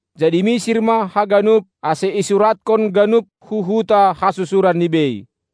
Jadi misir ma haganup, ase isuratkon, ganup hu huta hasusuranni bei.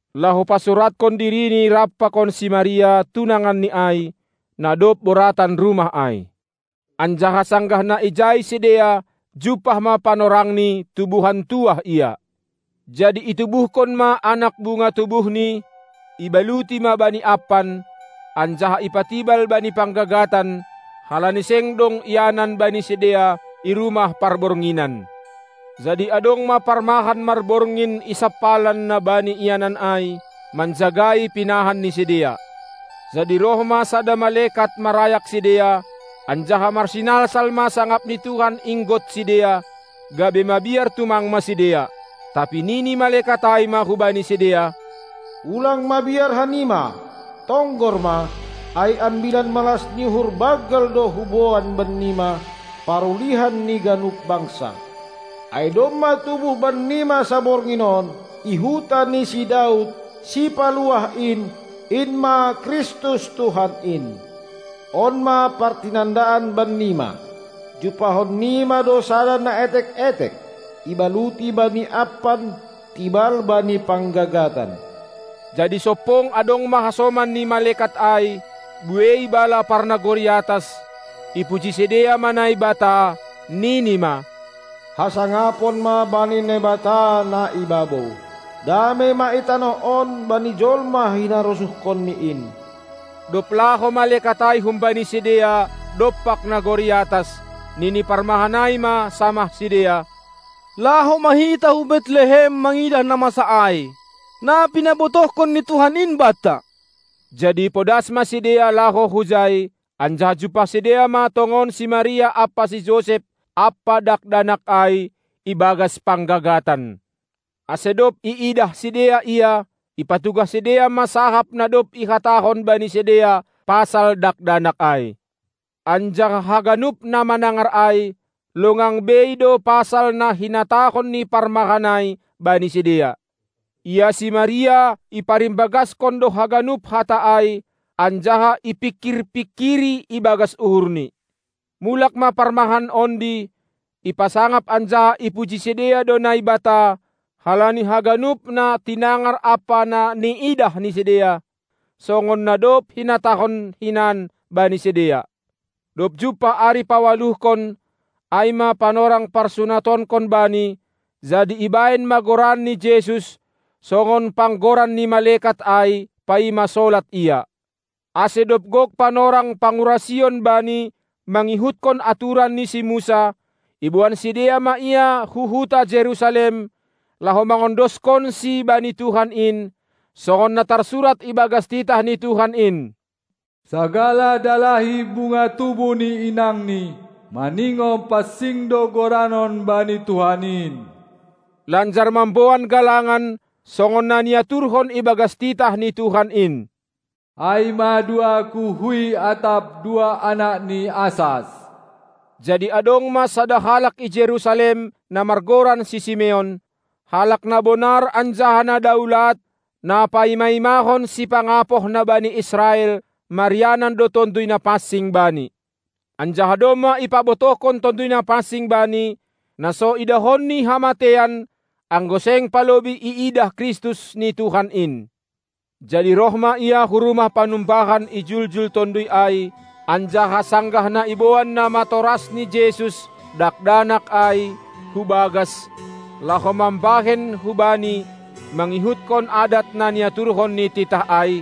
laho ma pasuratkon dirini rap pakon si Maria, tunanganni ai, na dob boratan rumah ai. Anjaha sanggah na ijai sidea, jumpah ma panorangni tubuhan tuah ia. Jadi itubuhkon ma anak bunga tubuhni, ibaluti ma bani ampan, anjaha ipatibal bani panggagatan, halani seng dong ianan bani sidea i rumah parbornginan. Jadi adong ma parmahan marborngin i sampalan na bani ianan ai, manjagai pinahan ni sidea. Jadi roh ma sada malekat marayak sidea, anjaha marsinalsal ma sangap ni Tuhan inggot sidea, gabe mabiar tumang ma sidea. Tapi nini malekat ai ma hubani sidea: Ulang mabiar hanima! Tonggor ma, ai ambilan malas ni uhur banggal do huboan bannima, parulihan ni ganup bangsa. Ai domma tubuh bannima saborngin on, i huta ni si Daud, Sipaluah in, in ma Kristus Tuhan in! On ma partinandaan bannima: Jumpahon nima do sada na etek-etek, ibaluti bani ampan, tibal bani panggagatan. Jadi sompong adong ma hasoman ni malekat ai, buei bala parnagori atas, ipuji sidea ma Naibata, nini ma: Hasangapon ma bani Naibata na i babou, damei ma i tanoh on bani jolma hinarosuhkonNi in. Dob laho malekat ai humbani sidea dompak nagori atas, nini parmahan ai ma samah sidea: Laho ma hita hu Betlehem mangidah na masa ai, na pinabotohkon ni Tuhan in banta. Jadi podas ma sidea laho hujai, anjaha jumpah sidea ma tongon si Maria ampa si Josep ampa Dakdanak ai ibagas panggagatan. Ase dob iidah sidea Ia, ipatugah sidea ma sahap na dob ihatahon bani sidea pasal Dakdanak ai. Anjaha haganup na manangar ai, longang bei do pasal na hinatahon ni parmahan ai bani sidea. Ia si Maria iparimbagaskon do haganup hata ai, anjaha ipingkirpingkiri ibagas uhurni. Mulak ma parmahan ondi, ipasangap anjaha ipuji sidea do Naibata halani haganup na tinangar ampa na niidah ni sidea, songon na dob hinatahon hinan bani sidea. Dob jumpah ari paualuhkon ai ma panorang parsunatonkon Bani, jadi ibahen ma goranni Jesus, songon panggoran ni malekat ai paima solat ia. Ase dob gok panorang pangurasion Bani magihutkon aturan ni si Musa, iboan sidea ma Ia hu huta Jerusalem, laho mangondoskonSi bani Tuhan in, songon na tarsurat ibagas titah ni Tuhan in; "Sagala dalahi bunga tubuh ni inangni, maningon pansing do goranon bani Tuhan in", lanjar mamboan galangan, songon na niaturhon ibagas titah ni Tuhan in, ai ma dua kuhuy atap dua anak ni asas. Jadi adong ma sada halak i Jerusalem, na margoran si Simeon, halak na bonar anjaha na daulat, na paimaimahon Sipangapoh na bani Israel; marianan do Tonduy Napansing bani. Anjaha domma ipabotohkon Tonduy Napansing bani, na so idahonni hamateian, anggo seng palobei iidah Kristus ni Tuhan in, Jadi roh ma ia hu rumah panumbahan ijuljul Tonduy ai. Anjaha sanggah na iboan namatorasni Jesus, Dakdanak ai hu bagas laho mambahen hu Bani mangihutkon adat na niaturhon ni titah ai,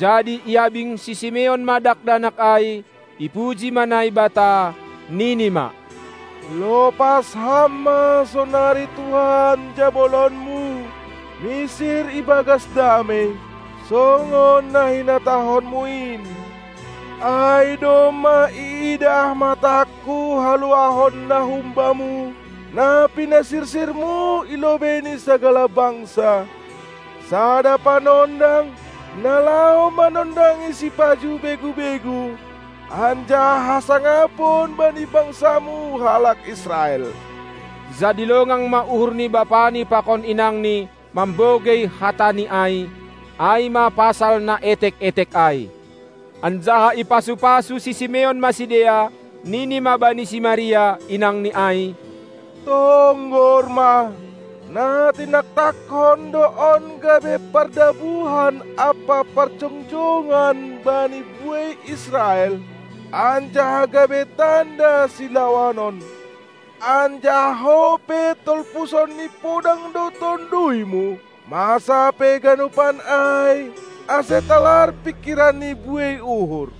jadi iabing si Simeon ma Dakdanak ai, ipuji ma Naibata, nini ma: Lopas Ham ma sonari Tuhan jabolonMu misir ibagas damei, songon na hinatahonMu in, ai domma iidah matangku haluahon na hum-Bamu, na pinasirsirMu i lobei ni sagala bangsa, sada Panondang, na laho manondangi sipajuh begu-begu, anjaha hasangapon bani bangsaMu halak Israel. Jadi longang ma uhur ni bapani pakon inangni mambogei hatani ai, ai ma pasal Na etek-etek ai. Anjaha ipasu-pasu si Simeon ma sidea, nini ma bani si Maria, inangni ai: Tonggor ma, na tinaktakkon do on gabe pardabuhan ampa parjongjongan bani buei Israel, anjaha gabe tanda silawanon. Anjaha ho pe tolpusan ni podang do tonduymu; masa pe ganupan ai, ase talar pingkiran ni buei uhur.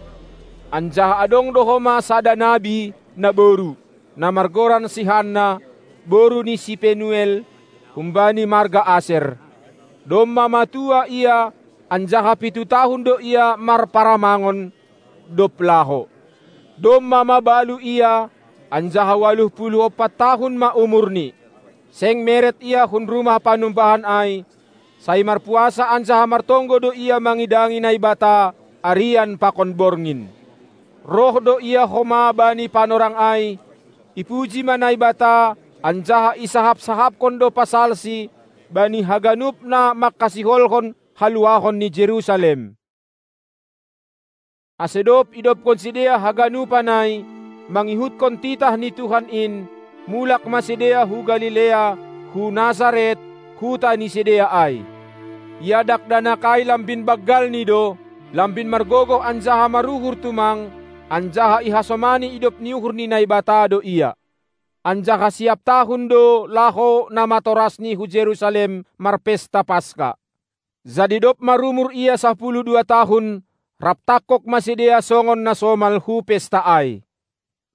Anjaha adong do homa sada nabi naboru, na margoran si Hanna, boru ni si Penuel, humbani marga Aser. Domma matua ia, anjaha pitu tahun do ia marparamangon, dob laho. Domma mabalu ia, anjaha ualuh puluh ompat tahun ma umurni. Seng meret ia hun rumah panumbahan ai, sai marpuasa anjaha martonggo do ia mangidangi Naibata arian pakon borngin. Roh do ia homa bani panorang ai, ipuji ma Naibata anjaha isahap-sahapkon do pasalSi bani haganup na mangkasiholhon haluahon ni Jerusalem. Ase dob idobkon sidea haganupan ai mangihutkon titah ni Tuhan in, mulak ma sidea hu Galilea, hu Nasaret, huta ni sidea ai. Ia Dakdanak ai lambin banggalni do, lambin margogoh anjaha maruhur tumang, anjaha ihasomani idop ni uhur ni Naibata do Ia. Anjaha siap tahun do laho namatorasNi hu Jerusalem marpesta Paska. Jadi dob marumur Ia sapuluh dua tahun, rap tangkog ma sidea songon na somal hu pesta ai.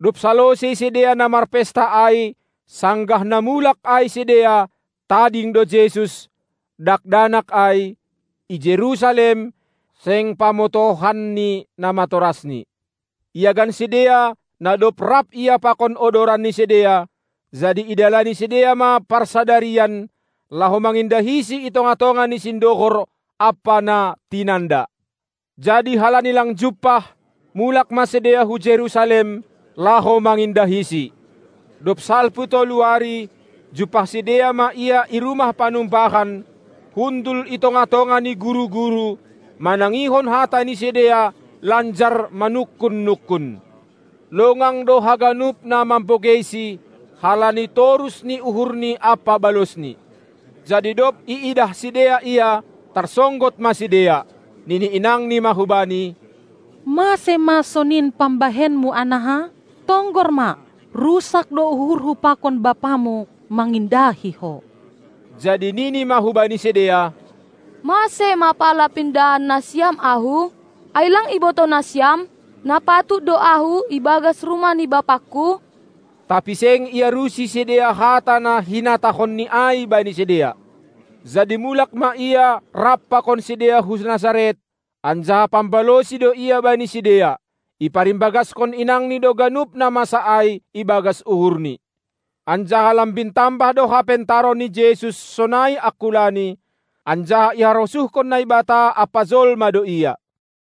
Dob salosei sidea na marpesta ai sanggah na mulak ai sidea, tading do Jesus, Dakdanak ai, i Jerusalem, seng pamotohan ni namatorasNi. Iagan sidea, na dob rap Ia pakon odoran ni sidea, jadi idalani sidea ma parsadarian, laho mangindahiSi i tongah-tongah ni sindohor ampa na tinanda. Jadi halani lang jumpah, mulak ma sidea hu Jerusalem, laho mangindahiSi. Dob salpu tolu ari, jumpah sidea ma Ia i rumah panumbahan, hundul i tongah-tongah ni guru-guru, manangihon hata ni sidea lanjar manungkun-nungkun. Longang do haganup na mabogeiSi, halani torus ni uhurNi ampa balosNi. Jadi dob iidah sidea Ia, tarsonggot ma sidea. Nini inangNi ma hu Bani: Mase ma sonin pambahenMu, anaha? Tonggor ma, rusak do uhurhu pakon bapamu mangindahi Ho! Jadi Nini ma hubani sidea: Mase ma pala pindahan nasiam Ahu? Ai lang ibotoh nasiam, na patut do Ahu ibagas rumah ni BapangKu? Tapi seng iarusi sidea hata na hinatahonNi ai bani sidea. Jadi mulak ma Ia rap pakon sidea hu Nasaret, anjaha pambalosi do Ia bani sidea. Iparimbagaskon inangNi do ganup na masa ai ibagas uhurni. Anjaha lambin tambah do hapentaran ni Jesus sonai angkulaNi, anjaha iharosuhkon Naibata ampa jolma do Ia.